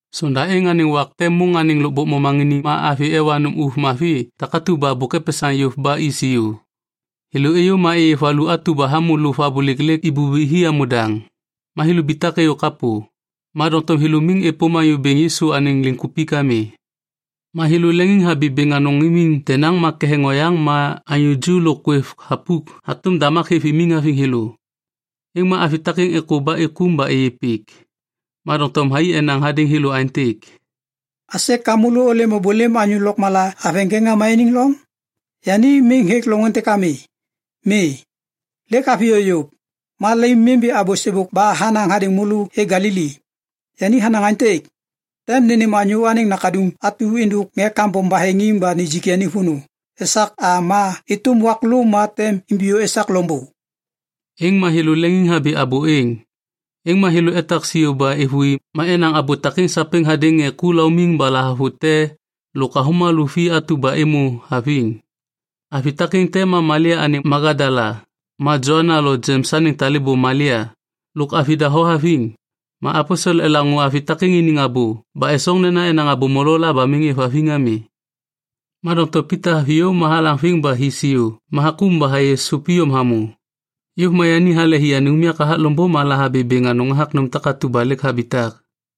Sonda êŋ anêŋ wak te môŋ anêŋ lôkbôk momaŋiniŋ ma avi ewa nôm ôv mavi takatu ba bôk epesaŋ yôv ba i siô. Thêlô êyô ma êyê valu atu ba hamô lôv abôlêk lêk ibubi hi hamô daŋ. Ma thêlô ibitak êyô kapô, ma doŋtom thêlô miŋ êpôm Anyô Bêŋ Yisu anêŋ kupik ami. Ma thêlô leŋiŋhabi bêŋ anôŋ imiŋ denaŋ ma ketheŋ oyaŋ ma anyô ju lôk kwêv thapuk hatôm damak hêv imiŋ haviŋ thêlô. Êŋ ma avi takêŋ êkô ba êkôm ba êyê pik. Ma doŋtom thai enaŋ hadêŋ thêlô aêntêk, “Aisê ka môlô ôlêm ôbôlêm anyô lôkmala haveŋ ŋê ŋama iniŋ loŋ? Yani miŋ hêk loŋ êntêk ami, ma yani lêk haviyô yôv. Ma môlô lemimbi abô sêbôk ba yani hanaŋ hadêŋ môlô hêk Galili. Yani hanaŋ aêntêk, ‘Tem nênêm Anyô Anêŋ Nakaduŋ atu êndôk ŋê kambom baheŋiŋ ba nijik yani vônô esak a ma êtôm wak lô ma tem imbiyô esak loŋbô.’” Êŋ ma thêlô leŋiŋhabi abô êŋ. Êŋ ma thêlô etak siô ba êvôi ma enaŋ abô takêŋ sapêŋ hadêŋ ŋê ku laumiŋ ba lahavute lôk avômalô vi atu ba êmô haviŋ. Avi takêŋ te ma Malia anêŋ Magadala, ma Joana lo Jems anêŋ talêbô Malia, lôk avi doho haviŋ. Ma aposel elaŋô avi takêŋ iniŋ abô ba esoŋ nena enaŋ abô molo la ba miŋ êvhaviŋ ami. Ma doŋtom Pita haviyô ma halaŋviŋ ba hi siô ma hakôm ba hayê sôp iyom hamô. Yôv ma yani hale hi anêŋ unyak hathak loŋbô ma lahabi bêŋ anôŋ hathak nôm takatu ba lêk habitak.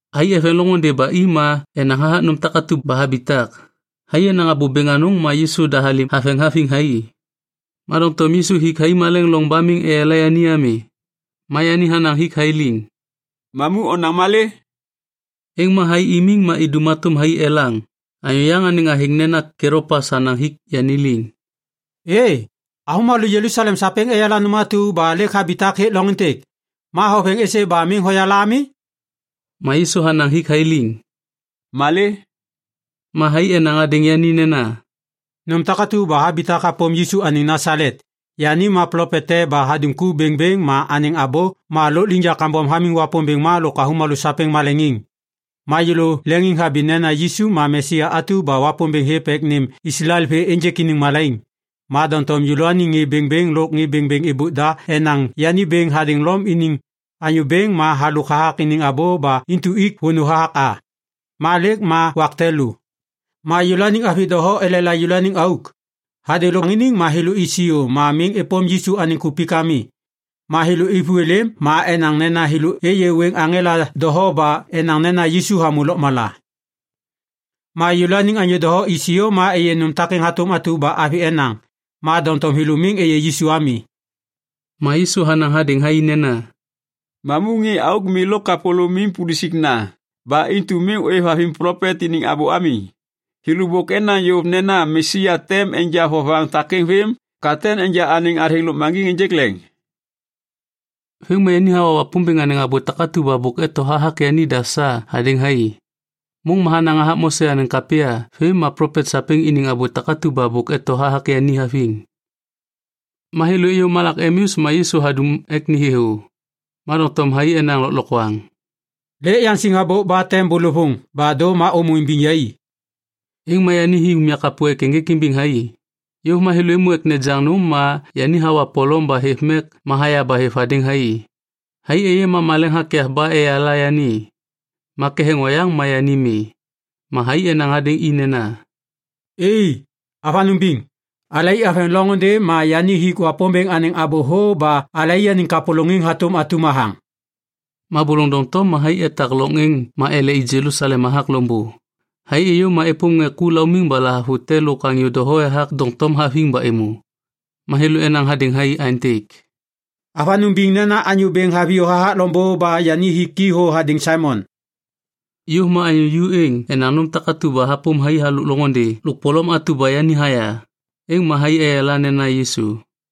Thai eveŋ loŋôndê ba i ma enaŋ hathak nôm takatu ba habitak. Thai enaŋ abô bêŋ anôŋ, ma Yisu da halêm haveŋ haviŋ thai, ma doŋtom Yisu hik thai maleŋ loŋ ba miŋ eyala yani ami. Ma yani hanaŋ hik thai liŋ, “Mamu onaŋ malê?” Êŋ ma thai imiŋ ma idum hatôm thai elaŋ. Anyô yaŋ anêŋ athêŋ nena Kelopas hanaŋ hik yani liŋ, “Êê, avômalô Jelusalem sapêŋ eyala nôm atu ba lêk habitak hêk loŋ êntêk, ma hoveŋ êsê ba miŋ hoyala ami?” Ma Yisu hanaŋ hik thai liŋ, “Malê?” Ma thai enaŋ hadêŋ yani nena, “Nôm takatu ba habitak hapôm Yisu anêŋ Nasalet. Yani ma plopet te ba hadum ku bêŋbêŋ ba anêŋ abô ma lôkliŋyak kambom hamiŋ Wapômbêŋ ma lôk avômalô sapêŋ maleŋiŋ. Ma yêlô leŋiŋhabi nena Yisu ma Mesia atu ba Wapômbêŋ hêv ek nêm Islael vê ênjêk iniŋ malaiŋ. Ma doŋtom alalôaniŋ ŋê bêŋbêŋ lôk ŋê bêŋbêŋ êbôk da enaŋ yani bêŋ hadêŋ Lom iniŋ anyô bêŋ ba halôk hathak iniŋ abô ba intu ik vônô hathak a. Ma lêk ma wak te lô. Ma yêlôaniŋ avi doho elela yêlôaniŋ auk. Hadêŋ lôkbôk momaŋiniŋ ma thêlô i siô ma miŋ êpôm Yisu anêŋ kupik ami. Ma thêlô êvô êlêm ma enaŋ nena thêlô êyê wêŋ aŋela doho ba enaŋ nena Yisu hamô lôkmala. Ma yêlôaniŋ anyô doho i siô ma êyê nôm takeŋ hatôm atu ba avi enaŋ, ma doŋtom thêlô miŋ êyê Yisu ami.” Ma Yisu hanaŋ hadêŋ thai nena, “Mamu ŋê auk mi lôk kapôlômim pulusikna ba intu miŋ ôêvhaviŋ plopet iniŋ abô ami! Thêlô bôk enaŋ yôv nena Mesia tem enja vovaŋ takêŋ vêm ka tem enja anêŋ athêŋ lôkmaŋgiŋ ênjêk leŋ.” Vêm ma yani hawa Wapômbêŋ anêŋ abô takatu ba bôk eto hathak yanida sa hadêŋ thai. Môŋ ma hanaŋ hathak Mose anêŋ kapya vêm ma plopet sapêŋ iniŋ abô takatu ba bôk eto hathak yani haviŋ. Ma thêlô êyô malak Emeus ma Yisu hadum ek ni thêthô. Ma doŋtom thai enaŋ lôklokwaŋ, “Lêk yaŋsiŋ habôk ba tem bôlôvôŋ ba dô ma ômô imbiŋ yai.” Êŋ ma yani hi unyak kapô ek ênjêk imbiŋ thai. Yôv ma thêlô êmô ek nejaŋ nôm ma yani hawa polom ba hêv mek ma haya ba hêv hadêŋ thai. Thai êyê ma maleŋ hakyav ba eyala yani. Ma ketheŋ oyaŋ ma yani mi. Ma thai enaŋ hadêŋ i nena, “Êê, avanôŋ biŋ. Alai aveŋ loŋôndê ma yani hik Wapômbêŋ anêŋ abô thô ba alaianiŋ kapôlôŋiŋ hatôm atum hathaŋ.” Ma bôlôŋ doŋtom ma thai etak loŋ êŋ ma ele i Jelusalem hathak loŋbô. Thai êyô ma êpôm ŋê ku laumiŋ ba lahavute lôk anyô doho ethak doŋtom haviŋ ba êmô. Ma thêlô enaŋ hadêŋ thai aêntêk, “Avanôŋ biŋ nena Anyô Bêŋ haviyô hathak loŋbô ba yani hik i thô hadêŋ Saimon.” Yôv ma anyô ju êŋ enaŋ nôm takatu ba hapôm thai halôk loŋôndê lôk polom atu ba yani haya, êŋ ma thai eyala nena Yisu.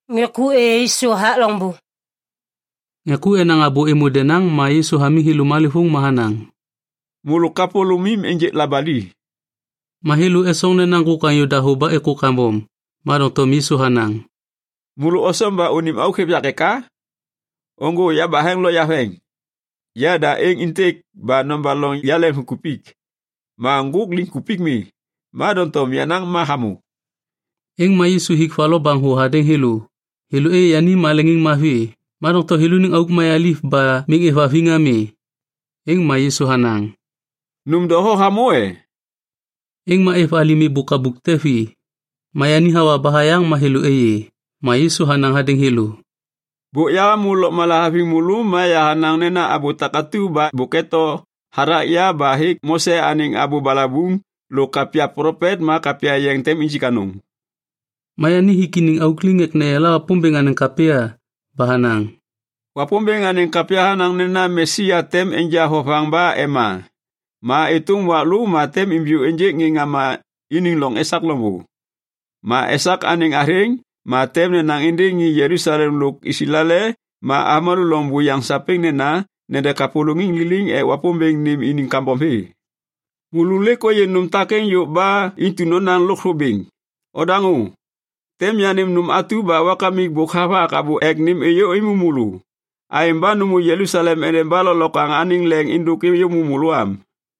Ŋê ku enaŋ abô êmô denaŋ ma Yisu hamiŋ thêlô malêvôŋ ma hanaŋ, “Môlô kapôlômim ênjêk labali!” Ma thêlô esoŋ nena ŋgôk anyô dahô ba êkô kambom. Ma doŋtom Yisu hanaŋ, “Môlô osoŋ ba unim auk hêv yak eka? Ôŋgô yabaheŋ lo yaveŋ. Yada êŋ êntêk ba nobaloŋ yaleŋviŋkupik. Ma ŋgôk liŋkupik mi, ma doŋtom yenaŋ ma hamô.” Êŋ ma Yisu hik va lo baŋ thô hadêŋ thêlô. Thêlô êyê yani ma leŋiŋmavi, ma doŋtom thêlôniŋ auk mayaliv ba miŋ êvhaviŋ ami. Êŋ ma Yisu hanaŋ, “Nôm doho hamô e?” Êŋ ma êv alim êbôk kabuk te vi, ma yani hawa ba hayaŋ ma thêlô êyê. Ma Yisu hanaŋ hadêŋ thêlô, “Bôk yahamô lôkmala haviŋ môlô, ma yahanaŋ nena abô takatu ba bôk eto hathak ya ba hêk Mose anêŋ Abô Balabuŋ lôk Kapya Plopet ma Kapya Yeŋ tem injik anôŋ.” Ma yani hik iniŋ auk liŋ ek neyala Wapômbêŋ anêŋ kapya ba hanaŋ, “Wapômbêŋ anêŋ kapya hanaŋ nena Mesia tem enja vovaŋ ba ema ma êtôm wak lô ma tem imbiyô ênjêk ŋê ŋama iniŋ loŋ esak loŋbô. Ma esak anêŋ athêŋ ma tem nenaŋ êndêŋ ŋê Jelusalem lôk Islael ma avômalô loŋ buyaŋ sapêŋ nena nede kapôlôŋiŋ liliŋ ek Wapômbêŋ nêm iniŋ kambom vê. Môlô lêk ôyê nôm takêŋ yôv ba intu nonaŋ lôkthô bêŋ. Odaŋô! Tem yanêm nôm atu ba Wakamik bôk havak abô ek nêm êyômô môlô. Aêŋ ba nômô Jelusalem endeba lôklokwaŋ anêŋ leŋ êndôk êyômô môlô am.”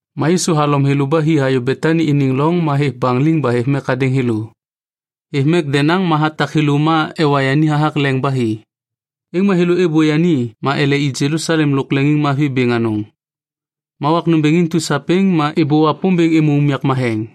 Ma Yisu halom thêlô ba hi hayô Betani iniŋ loŋ ma hêv baŋ liŋ ba hêv mek hadêŋ thêlô. Hêv mek denaŋ ma hatak thêlô ma ewa yani hathak leŋ ba hi. Êŋ ma thêlô êbô yani ma ele i Jelusalem lôk leŋiŋmavi bêŋ anôŋ. Ma wak nômbêŋ intu sapêŋ ma êbô Wapômbêŋ êmô unyak matheŋ.